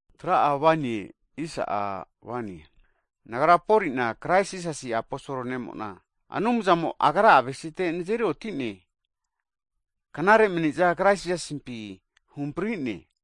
Hagi nagra Poli'na, Krais Jisasi aposol ne'mo'na Anumzamo Agra avesite huhamprinanteno knare mani'zana Krais Jisasimpi huhampri'ne.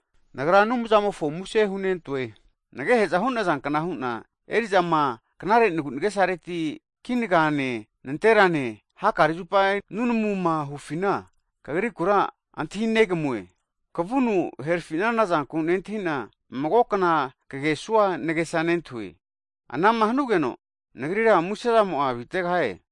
Nagra Anumzamofo muse hunentoe, nagehe'za hu'nazankna hu'na, eri'zama'a knare'nagu nagesareti kinagane nanterane hakare zupa nunamuma hufina kagrikura antahi negamue. Kavunu herfi'nana zanku nentahi'na mago kna kagesua nagesa nentahue. Anama hanugeno nagrira muse zamo'a avitegahie.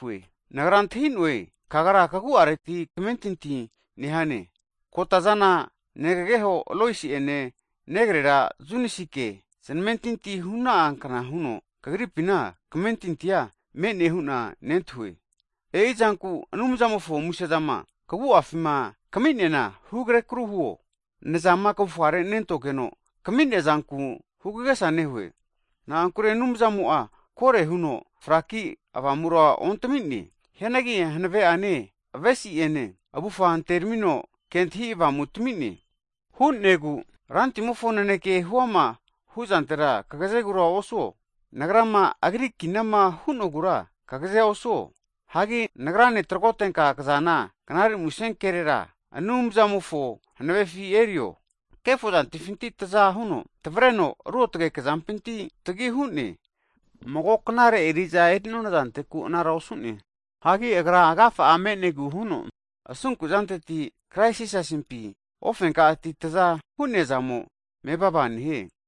Nagra antahi'noe kagra kagu'areti kmentintia nehane, kota'zana negageho Lois'ene negrera Yunesike znamentinti huna'a kna huno kagripina kamentintia me'ne hu'na nentahue. E'izanku Anumzamofo musezama (gift) kagu'afima kami'neana hugre kru huo, nazama kavufgare nentogeno, kami'nea zanku hugagesa nehue. Na'ankure Anumzamo'a kore huno fraki Avamura ontami'ne. Hianagi hanave'ane, avesi'ene, avufga antermino kentahi avamu tami'ne. Hu'negu Rantimofo naneke huama hu'zantera kagzegura osuo, nagrama Agri kinama hu'nogura kagazea osuo. Hagi nagrane tragotenka knazana Knare Musenkerera (gospol) Anumzamofo hanavefi erio. Kefo zantifinti taza huno tvareno ruotge kezampinti tagihu'ne. Mago knare eriza eri'nona zanteku anara osu'ne. Hagi Agra agafa'a me'negu huno asunku'zanteti Krais Jisasimpi ko'ma ofenka'ati taza hu'neazamo mevava nehie.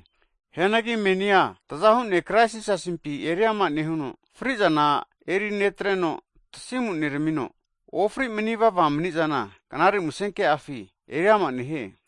Hianagi menia tazahu ne' Krais Jisasimpi eriama nehuno, fri'zana eri netreno, tasimu neramino ofri manivava mani'zana Knare Musenke'afi (gospol) eriama nehie.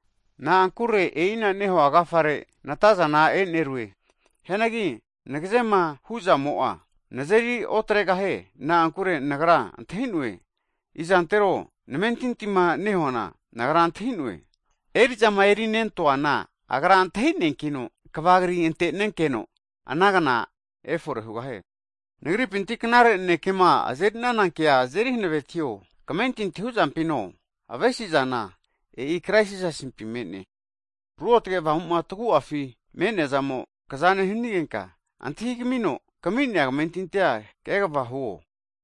Na'ankure e'ina nehua agafare natazana e'nerue. Hianagi nagazema hu'zamo'a nazeri otregahie. Na'ankure nagra izantero namentintima nehumofona antahi'na kena nehu'na, eri'zama'a erinentoana, Agra antahineankino kva kri ante'nenkeno ana kna efore hugahie. Nagrama knare nanekema kasmugenka azerinana kea azeri hanavetio. Kamentinti hu'zampine, vahe'ma avesi'zana, e'i Krais Jisasimpi me'ne. Ruotge Avamu'ma tagu'afi mani'nemo kaza nehanigenka, antahi kamino kami'nea kamentintia kegava huo.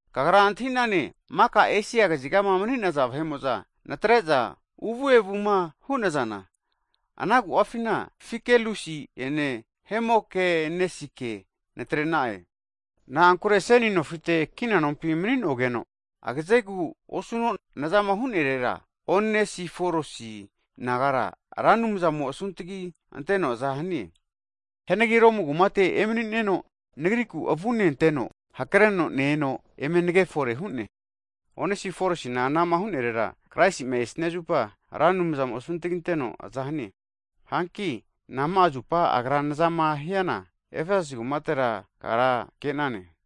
Kagra antahi'nane maka Esia kaziga mani'naza vahe'mo'za natre'za uvu evuma hu'nazana, ana agu'afina Figelusi'ene Hemogenesi'ke natrena'e. Nagrama seni nofite kina nompima mani'nogeno, agazegu osuno nazama hu'nerera, Onesiforusi nagara Ra Anumzamo asuntgi anteno aza hanie. Hianagi Romu kumate enehanatino'a nagriku avune anteno hakreno ne-eno eme nage forehu'ne. Onesiforusina anama hu'nerera, Kraisi'ma esnia zupa Ra Anumzamo asuntaginteno aza hanie. Hanki nama'a zupo agra nazama hiana, Efesasi kumatera kagra ke'nane.